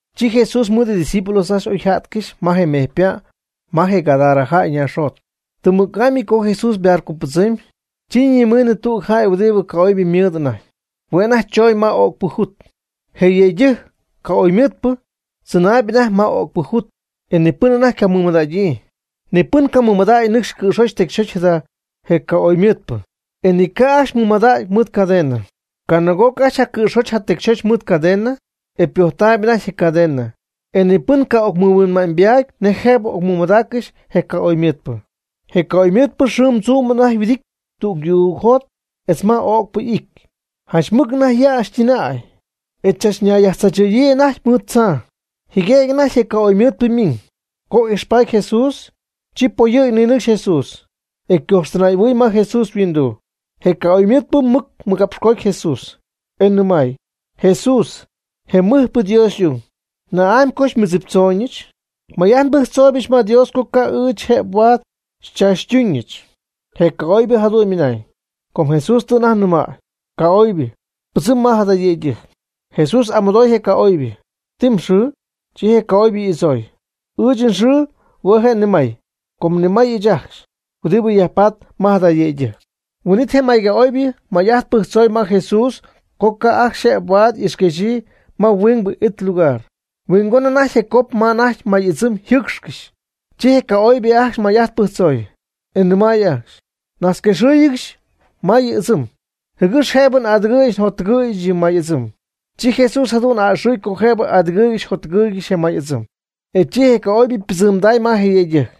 Chi Jesús mɨɨd ydiscípulos ajcxy oyja'tcɨxy ma je mejypa' ma je Gadara jäy ñaaxjot. Tɨm mɨc'amy co Jesús ybarcobɨdzɨmy, chi nimiiñ tüg jäy huɨdibɨ ca'oybɨ mɨɨd anajty. Hue' anajty chooñ ma öcpɨ jut. Je yëydɨjc, ca'oybɨmɨɨdpɨ, tzɨnaayb anajty ma öcpɨ jut. E ni pɨn anajty ycamɨmadägyii. Ni pɨn camɨmadacy nɨcx cɨ̈xoch tecyxoch jada je ca'oybɨmɨɨdpɨ, e ni ca' ajcxy mɨmadacy mɨɨd cadena. Canaag'oc ajcxy jacɨ̈xojch jatecyxojch mɨɨd cadena, e ypojtaayb anajty je cadena. Ni pɨn camɨhuinma'ñybaady nej jëb ocmɨmadaaccɨxy je ca'oybɨmɨɨdpɨ. Je ca'oybɨmɨɨdpɨ xɨɨm tzuum anajty yhuɨdity tüg yuugjot etz ma öcpɨ it, janch mɨc anajty yäxytɨnäy. E chachnayyajtzaachɨ̈yii anajty mɨɨd tzaa. Jɨguëgy anajty je ca'oybɨmɨɨdpɨ ymiiñ, co ijxpaty Jesús, chi poyɨ̈gy ninɨcxy Jesús, e ycojxtɨnay'ahuɨy ma Jesús yhuinduu. Je ca'oybɨmɨɨdpɨ mɨc mɨgapxcooty Jesús, e nɨmay: ―Jesús, je mɨjpɨ Dios y'ung, ¿na'amy co xymɨdziptzooñɨch? May'ajt nbɨjctzooybɨch ma Dios co ca' ɨɨch jëb huaad xychaachytuñɨch. Je ca'oybɨ jadu'n ymɨnañ, com Jesús tɨ anajty nɨmäy: ―Ca'oybɨ, pɨdzɨmb ma jada yëydɨjc. Jesús y'amɨdooy je ca'oybɨ: ―¿Ti mxɨɨ? Chi je ca'oybɨ y'adzooy: ―Ɨɨch nxɨɨ hue' je' “ni may”, com ni may ɨɨch ajcxy huɨdibɨ yajpatp ma jada yëydɨjc. Huin'it je may ca'oybɨ may'ajt pɨjctzoy ma Jesús co ca' ajcxy jëb huaad ixquexyii ma huingbɨ it lugar. Huingon anajty je cop ma anajty may ɨdzɨm yjɨɨcxcɨxy. Chi je ca'oybɨ ajcxy may'ajt pɨjctzoy, e nɨmay ajcxy: ―Najtzquexɨɨyg ma yɨ may ɨdzɨm, jɨgɨx jëbɨ n'adɨgɨ̈yɨch njottɨgɨ̈yɨch yɨ may ɨdzɨm. Chi Jesús jadu'n a'ɨxɨy co jëbɨ adɨgɨɨygɨxy jotɨgɨɨygɨxy je may ɨdzɨm. Chi je ca'oybɨ ypɨdzɨmday ma je yëydɨjc,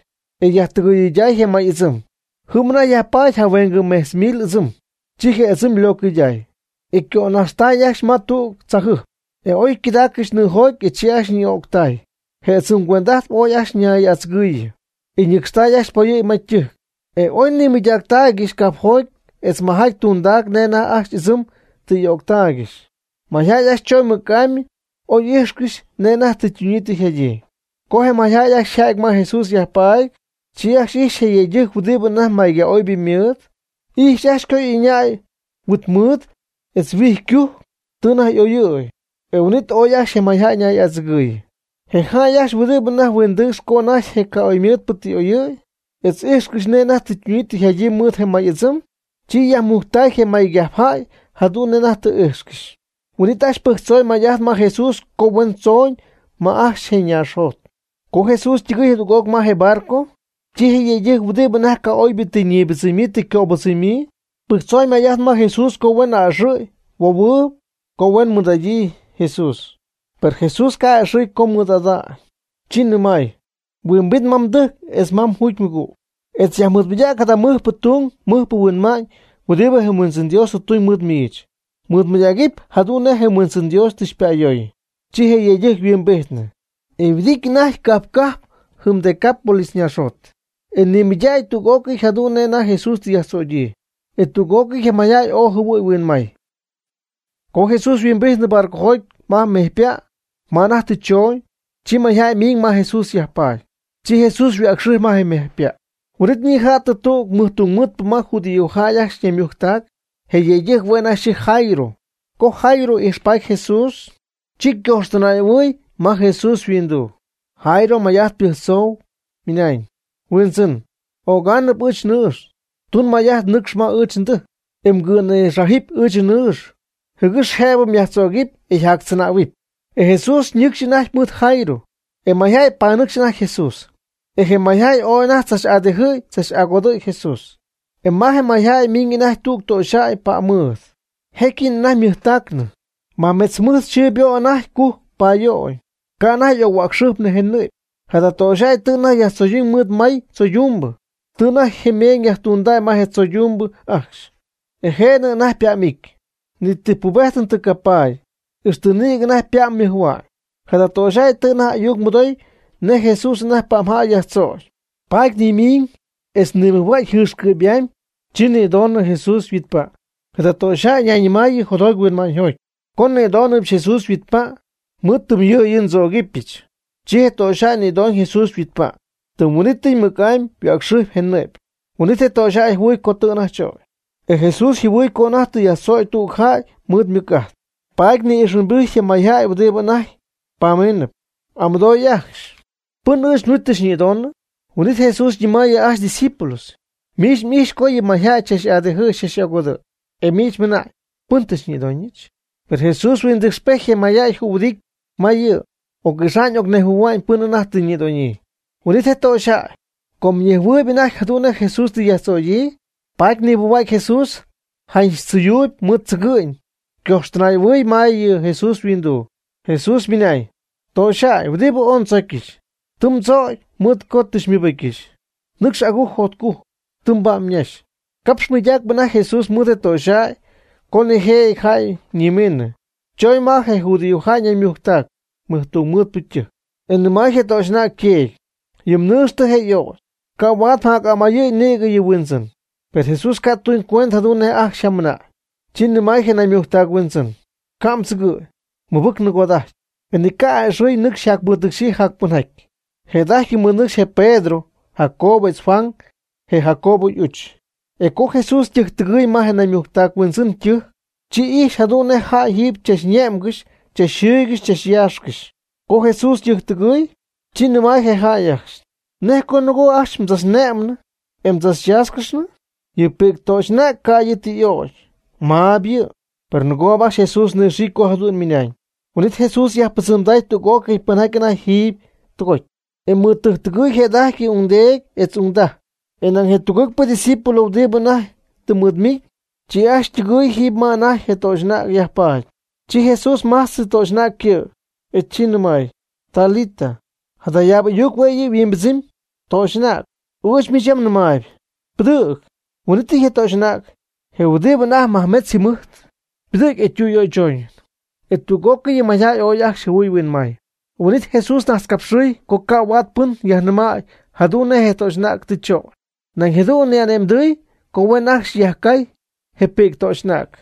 e yajtɨgɨyday je may ɨdzɨm ajcxy. Jɨm anajty yajpaady jahuengɨ mejtz mil ɨdzɨm. Chi je ɨdzɨm ylocjɨydaay, e ycögänaxtaay ajcxy ma tüg tzajɨjp, e oy ycädaaygɨxy nɨɨjoty, e chi ajcxy ñɨɨ'ögtay. Je ɨdzɨm cuend'ajtp ajcxy ooy ajcxy ñay'adzɨgɨɨyɨ, e nɨcxtay ajcxy poyɨ̈gy ma ytɨjc. E oy nimɨydaaccɨxy cajpjoty etz majaty tundac nej anajty ajcxy y'ɨdzɨm y'öctaaygɨxy. Mayjäy ajcxy choñ mɨc'amy oy íjxcɨxy nej anajty tɨ ytunyii tɨ yjadyii. Co je mayjäy ajcxy yja'ty ma Jesús yajpaady, chi ajcxy ijxy je yëydɨjc huɨdibɨ anajty mayca'oybɨ ymɨɨd. Ijxy ajcxy co ɨñäy huit mɨɨd etz huijycujc, tɨ anajty y'oyɨ̈y. E huin'it ooy ajcxy je mayjäy ñay'adzɨgɨɨyɨ. Je jäy ajcxy huɨdibɨ anajty huindɨcxp co anajty je ca'oybɨmɨɨdpɨ tɨ y'oyɨ̈y, etz íjxcɨxy nej tɨ ytunyii tɨ yjadyii mɨɨd je may ɨdzɨm, chi yajmɨydactay je maycajpjäy jadu'n nej anajty tɨ ijxcɨxy. Huin'it ajcxy pɨjctzoy may'ajt ma je Jesús, co huen tzooñ ma ajcxy je ñaaxjot. Co Jesús ytɨgɨɨy jadüg'oc ma je barco, chi je yëydɨjc huɨdibɨ anajty ca'oybɨ tɨ ñibɨdzɨmyii tɨ ycöbɨdzɨmyii, pɨjctzoy may'ajt ma Jesús co huen a'ɨxɨ̈y möhuɨp co huen mɨɨd'idyii Jesús. Per Jesús ca' a'ɨxɨ̈y co ymɨɨd'idyii, chi nɨmay: ―Huimbit ma mdɨjc etz mjugymɨgüg, e yajmɨɨdmɨydäg jada mɨjpɨ tung mɨjpɨ huinma'ñ huɨdibɨ je Huindzɨn Dios tɨ tuñ mɨɨd miich. Mɨɨdmɨydägɨpy jadu'n nej je Huindzɨn Dios tɨ xypa'ayoy. Chi je yëydɨjc yhuimbijtnɨ, e huɨdijtp anajty cajp cajp jɨm Decápolis ñaaxjot, e nimɨydactay tüg'ócɨy jadu'n nej Jesús tɨ yajtzögyii, e tüg'ócɨy je mayjäy ooy jɨhuɨy huinmay. Co Jesús huimbijty barcojoty ma je mejypa' ma anajty tɨ chooñ, chi mayjäy ymiiñ ma Jesús yajpaady, chi Jesús yhuäcxɨjpy ma je mejypa'. Huin'it Jesús ñija'tɨ tüg mɨjtungmɨɨdpɨ ma yɨ judíojäy ajcxy ñaymujctac. Je yëydɨjc hue' anajty xɨɨjɨty Jairo. Co Jairo ijxpaty Jesús, chi ñayhuɨjojtac ma Jesús yhuinduu. Jairo may'ajt pɨjctzoy, ymɨnañ: ―Huindzɨn, ögaanɨp ɨɨch nnɨɨx. Tun may'ajt nɨcxy ma ɨɨch ndɨjc, e mgɨ̈nïxájɨp ma ɨɨch nnɨɨx, jɨgɨx jëbɨ myajtzögɨp, e yjactzɨnähuɨp. E Jesús nɨcxp anajty mɨɨd Jairo, e mayjäy panɨcxy anajty Jesús. E je mayjäy ooy anajty tzach'adijɨ'y tzach'agodɨ'y Jesús. E ma je mayjäy ymiiñ anajty tüg töxyjäy pa'm mɨɨd, jécyɨñ anajty ymɨjtacnɨ. Majmetz jɨmɨjt yxɨɨ ybo' anajty cujc payöy, ca' anajty y'oc-huäcxɨjpnɨ je nɨ'py. Jada töxyjäy tɨ anajty yajtzoyduñ mɨɨd may tzoydumbɨ, tɨ anajty ymeeñ yajtundäy ma je tzoydumbɨ ajcxy. E je'nɨ anajty ypa'm'ity. Ni ti pubéjtɨn tɨ capaady, ixtɨ nïgɨ anajty ypa'm mɨjhua'ñ. Jada töxyjäy tɨ anajty ayuc mɨdoy nej Jesús anajty pa'mjäy yajtzögy, paady nimiiñ etz nimɨjhuägy jɨɨxcɨ'py'amy, chi nïdoonɨ Jesús yhuitpa'. Jada töxyjäy nayñɨmaayɨ jotjoty huinma'ñyjoty: “Co nnïdónɨbɨch Jesús yhuitpa', mɨɨd tɨm yɨ'yɨ ndzögɨbɨch.” Co je töxyjäy nïdoñ Jesús yhuitpa', tɨm huin'ítɨy mɨc'amy yhuäcxɨjp je nɨ'py. Huin'it je töxyjäy jɨhuɨy co anajty tɨ chögy. E Jesús jɨhuɨɨy co anajty tɨ yajtzögy tüg jäy mɨɨd ymɨc'ajt, paady ni'ijxhuimbijty je mayjäy huɨdibɨ anajty pamíinɨp, y'amɨdooy ajcxy: ―¿Pɨn ɨɨch nhuit tɨ xyñïdonɨ? Huin'it Jesús ñɨmaayɨ ajcxy ydiscípulos: ―Miich m'ijxpy co yɨ mayjäy xychach'adijɨ̈y xychach'agodɨ̈y, e miich mɨna'ñ: “¿Pɨn tɨ xyñïdóñɨch?” Per Jesús huindɨcxypejty je mayjäy jühuɨdity ma yɨ', oc'ixa'ñ ocnejhuɨ̈hua'ñ pɨn anajty tɨ ñïdonyii. Huin'it je töxyjäy, com ñejhuɨɨyb anajty jadu'n nej Jesús tɨ yajtzögyii, paady nimɨjhua'cy Jesús janch tzɨyuuyb mɨɨd tzɨgɨ'ñ ñayhuɨjojtacɨ ma yɨ' yhuinduu. Jesús ymɨnañ: ―Töxyjäy huɨdibɨ ooy ndzócyɨch, tɨ mdzögy mɨɨd co tɨ xymɨbɨ́cyɨch. Nɨcx agujc jotcujc, tɨ mba'm ñaxy. Capxp mɨydacp anajty Jesús mɨɨd je töxyjäy co nijëjɨty jäy ñimiinɨ, choñ ma je judío jäy ñaymujctac mɨjtungmɨɨdpɨ ytɨjc, e nɨmay je töxy'anäg yteedy: ―Yɨ mnɨɨx tɨ je y'ögy. Ca' huaad mjac'amayɨ̈y nïg yɨ Huindzɨn Jesús. Per Jesús ca' tuñcuend jadu'n nej ajcxy yjamɨna'ñ, chi nɨmay je naymujctac huindzɨn: ―Ca' mdzɨgɨ̈y, mɨbɨc nɨgoda'ajty. E ni ca' jac'a'ɨxɨy nɨcxy yjacmɨɨdnɨcxyii jacpɨnjaty. Jëda'ajty mɨɨdnɨcxy je Pedro, Jacobo etz Juan, je Jacobo y'uch. E co Jesús ytɨjctɨgɨɨy ma yɨ naymujctac huindzɨn ytɨjc, chi ijxy jadu'n nej jäy jiiby chachne'mgɨxy chachjɨɨygɨxy chachyaaxcɨxy. Co Jesús tɨjctɨgɨɨy, chi nɨmay je jäy ajcxy: ―¿Nej co nɨgoo ajcxy mdzachne'mnɨ, e mdzachyáaxcɨxnɨ? Yɨ pi'c töxy'anäg ca' yɨ' tɨ y'ögy, maab yɨ'. Per nɨgoob ajcxy Jesús nɨxiicy co jadu'n ymɨna'ñ. Huin'it Jesús yajpɨdzɨmday tüg'ócɨy pɨnjaty anajty jiiby tɨgoty, e mɨɨd tɨjc tɨgɨy jëda'ajty je ungdeedy etz ungdaj, e nañ je tugɨɨgpɨ ydiscípulos huɨdibɨ anajty tɨ mɨɨd miiñ. Chi ajcxy ytɨgɨy jiiby ma anajty je töxy'anäg yajpaady. Chi Jesús májtzɨy yɨ töxy'anäg ycɨ', e chi nɨmay: ―Talita, cumni ―jadayaab ayuc hue' yɨ' yhuimbɨdzɨmy: Töxy'anäg, ɨɨch miich yam nɨmaayb, pɨdɨ̈g. Huin'ítɨy je töxy'anäg, je huɨdibɨ anajty majmetz yjɨmijt, ypɨdɨ̈gy e ytüyöychoñ. E tüg'ócɨy yɨ mayjäy ooy ajcxy jɨhuɨy huinmay. Huin'it Jesús najtzcapxɨɨy co ca' huaad pɨn yajnɨmay jadu'n nej je töxy'anäg tɨ chögy, nañ jadu'n ni'ane'mdɨy co huen ajcxy yajcay je pi'c töxy'anäg.